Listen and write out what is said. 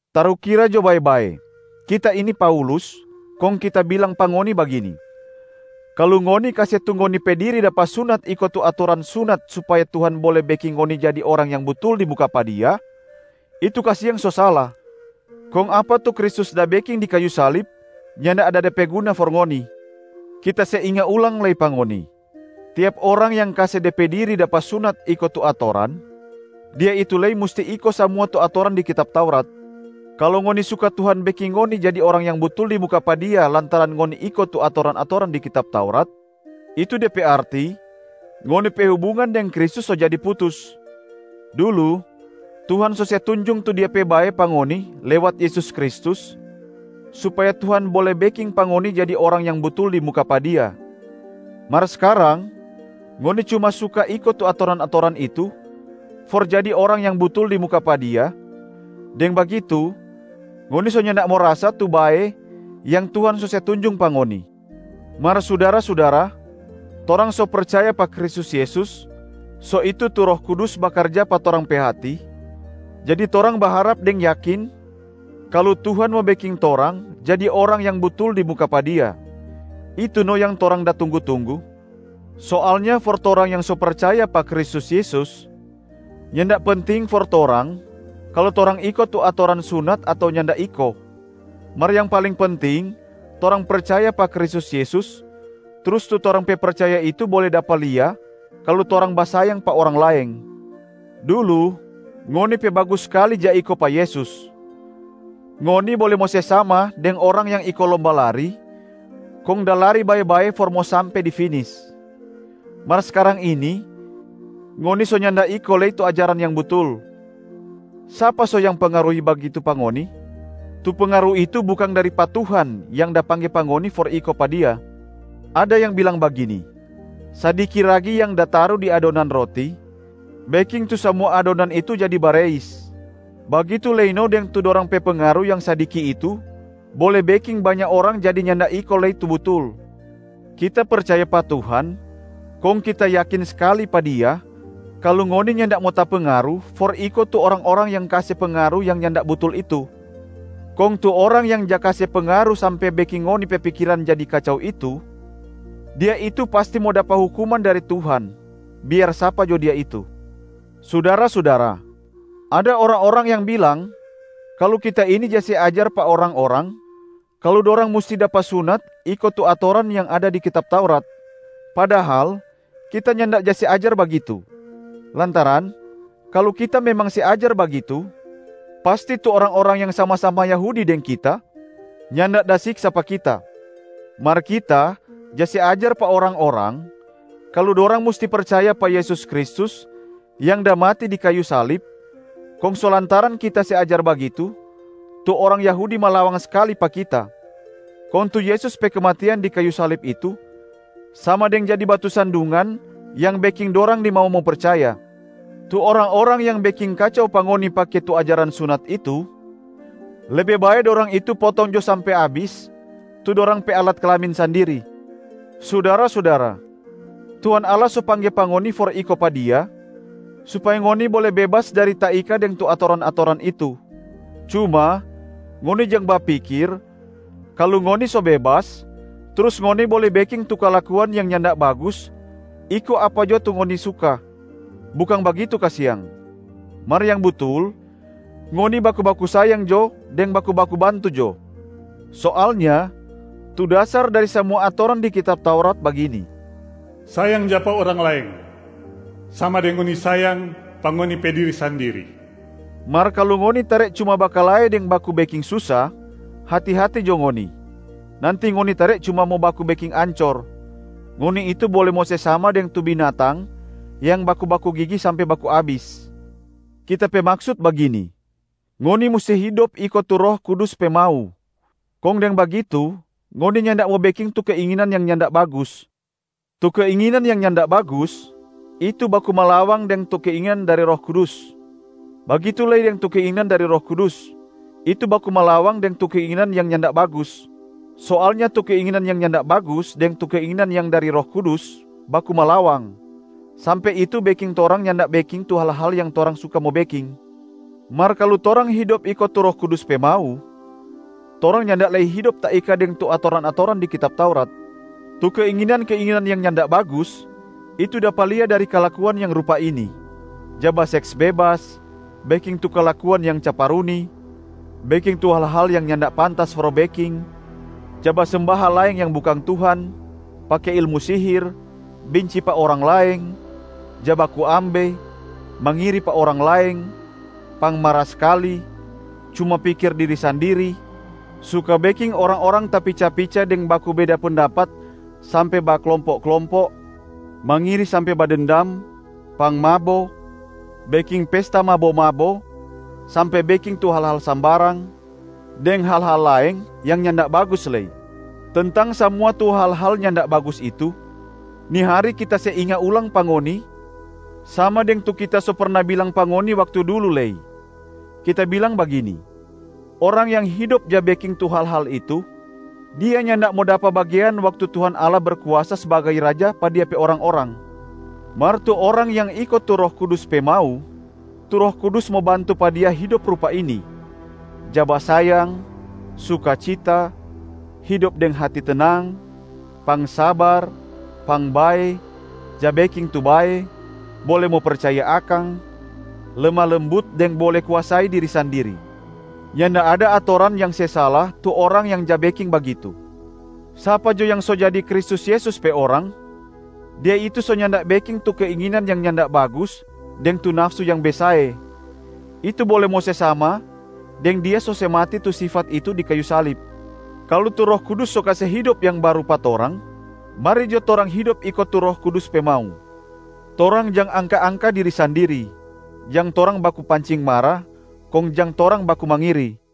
Tarukira jo bae-bae, kita ini Paulus, kong kita bilang pa ngoni bagini: kalu ngoni kase tu ngoni pe diri dapa sunat iko tu atoran sunat supaya Tuhan bole beking ngoni jadi orang yang butul di muka pa Dia, itu kasiang so sala, kong apa tu Kristus da beking di kayu salib nyanda ada de pe guna for ngoni. Kita se inga ulang lei pa ngoni: tiap orang yang kase de pe diri dapa sunat iko tu atoran, dia itu lei musti iko samua tu atoran di kitab Taurat. Kalu ngoni suka Tuhan beking ngoni jadi orang yang butul di muka pa Dia lantaran ngoni iko tu atoran-atoran di kitab Taurat, itu de pe arti ngoni pe hubungan deng Kristus so jadi putus. Dulu Tuhan so se tunjung tu Dia pe bae pa ngoni lewat Yesus Kristus supaya Tuhan bole beking pa ngoni jadi orang yang butul di muka pa Dia, mar skarang ngoni cuma suka iko tu atoran-atoran itu for jadi orang yang butul di muka pa Dia, deng bagitu ngoni so nyanda mo rasa tu bae yang Tuhan so se tunjung pa ngoni. Mar sudara-sudara, torang so percaya pa Kristus Yesus, so itu tu Roh Kudus bakarja pa torang pe hati, jadi torang baharap deng yakin kalu Tuhan mo beking torang jadi orang yang butul di muka pa Dia, itu no yang torang da tunggu-tunggu. Soalnya for torang yang so percaya pa Kristus Yesus, nyanda penting for torang kalu torang iko tu atoran sunat ato nyanda iko, mar yang paling penting torang percaya pa Kristus Yesus trus tu torang pe percaya itu bole dapa lia kalu torang basayang pa orang laeng. Dulu, ngoni pe bagus skali ja iko pa Yesus, ngoni bole mo se sama deng orang yang iko lomba lari kong da lari bae-bae for mo sampe di finis. Mar skarang ini ngoni so nyanda iko lei tu ajaran yang butul. Sapa so yang pengaruhi bagitu pa ngoni? Tu pengaru itu bukang dari pa Tuhan yang da pangge pa ngoni for iko pa Dia. Ada yang bilang bagini, “Sadiki ragi yang da taru di adonan roti, beking tu samua adonan itu jadi bareis,” bagitu lei no deng tu dorang pe pengaru yang sadiki itu bole beking banya orang jadi nyanda iko lei tu butul. Kita percaya pa Tuhan, kong kita yakin skali pa Dia kalu ngoni nyanda mo tapengaru for iko tu orang-orang yang kase pengaru yang nyanda butul itu. Kong tu orang yang ja kase pengaru sampe beking ngoni pe pikiran jadi kacau itu, dia itu pasti mo dapa hukuman dari Tuhan, biar sapa jo dia itu. Sudara-sudara, ada orang-orang yang bilang kalu kita ini ja se ajar pa orang-orang kalu dorang musti dapa sunat iko tu atoran yang ada di kitab Taurat. Padahal kita nyanda ja se ajar bagitu, lantaran kalu kita memang se ajar bagitu pasti tu orang-orang yang sama-sama Yahudi deng kita nyanda da siksa pa kita. Mar kita ja se ajar pa orang-orang kalu dorang musti percaya pa Yesus Kristus yang da mati di kayu salib, kong so lantaran kita se ajar bagitu tu orang Yahudi malawang skali pa kita, kong tu Yesus pe kematian di kayu salib itu sama deng jadi batu sandungan yang beking dorang nimau mo percaya. Tu orang-orang yang beking kacau pa ngoni pake tu ajaran sunat itu, lebe bae dorang itu potong jo sampe abis tu dorang pe alat kelamin sandiri! Sudara-sudara, Tuhan Allah so pangge pa ngoni for iko pa Dia supaya ngoni bole bebas dari taika deng tu atoran-atoran itu. Cuma ngoni jang bapikir kalu ngoni so bebas trus ngoni bole beking tu kalakuan yang nyanda bagus iko apa jo tu ngoni suka, bukang bagitu kasiang. Mar yang butul, ngoni baku-baku sayang jo deng baku-baku bantu jo. Soalnya tu dasar dari samua atoran di kitab Taurat bagini, “Sayang jo pa orang laeng sama deng ngoni sayang pa ngoni pe diri sandiri.” Mar kalu ngoni tare cuma bakalae deng baku beking susa, hati-hati jo ngoni, nanti ngoni tare cuma mo baku beking ancor, ngoni itu bole mo se sama deng tu binatang yang baku-baku gigi sampe baku abis. Kita pe maksut bagini: ngoni musti hidop iko tu Roh Kudus pe mau, kong deng bagitu ngoni nyanda mo beking tu keinginan yang nyanda bagus. Tu keinginan yang nyanda bagus, itu baku malawang deng tu keinginan dari Roh Kudus. Bagitu lei deng tu keinginan dari Roh Kudus, itu baku malawang deng tu keinginan yang nyanda bagus. Soalnya tu keinginan yang nyanda bagus deng tu keinginan yang dari Roh Kudus baku malawang, sampe itu beking torang nyanda beking tu hal-hal yang torang suka mo beking. Mar kalu torang hidop iko tu Roh Kudus pe mau, torang nyanda lei hidop taika deng tu atoran-atoran di kitab Taurat. Tu keinginan-keinginan yang nyanda bagus, itu dapa lia dari kalakuan yang rupa ini: ja baseks bebas, beking tu kalakuan yang caparuni, beking tu hal-hal yang nyanda pantas for beking, ja basemba hal laeng yang bukang Tuhan, pake ilmu sihir, binci pa orang laeng, ja baku ambe, mangiri pa orang laeng, pangmara skali, cuma pikir diri sandiri, suka beking orang-orang tapica-pica deng baku beda pendapat sampe baklompo-klompo, mangiri sampe badendam, pangmabo, beking pesta mabo-mabo sampe beking tu hal-hal sambarang, deng hal-hal laeng yang nyanda bagus lei. Tentang samua tu hal-hal nyanda bagus itu, ni hari kita se inga ulang pa ngoni sama deng tu kita so perna bilang pa ngoni waktu dulu lei, kita bilang bagini: orang yang hidop ja beking tu hal-hal itu, dia nyanda mo dapa bagean waktu Tuhan Allah Berkuasa sbagai Raja pa Dia pe orang-orang. Mar tu orang yang iko tu Roh Kudus pe mau, tu Roh Kudus mo bantu pa dia hidop rupa ini: ja basayang, sukacita, hidop deng hati tenang, pangsabar, pangbae, ja beking tu bae, bole mo percaya akang, lemah lembut deng bole kuasai diri sandiri. Nyanda ada atoran yang se sala tu orang yang ja beking bagitu. Sapa jo yang so jadi Kristus Yesus pe orang, dia itu so nyanda beking tu keinginan yang nyanda bagus deng tu nafsu yang besae, itu bole mo se sama deng dia so se mati tu sifat itu di kayu salib. Kalu tu Roh Kudus so kase hidop yang baru pa torang, mari jo torang hidop iko tu Roh Kudus pe mau. Torang jang angka-angka diri sandiri, jang torang baku pancing mara, kong jang torang baku mangiri.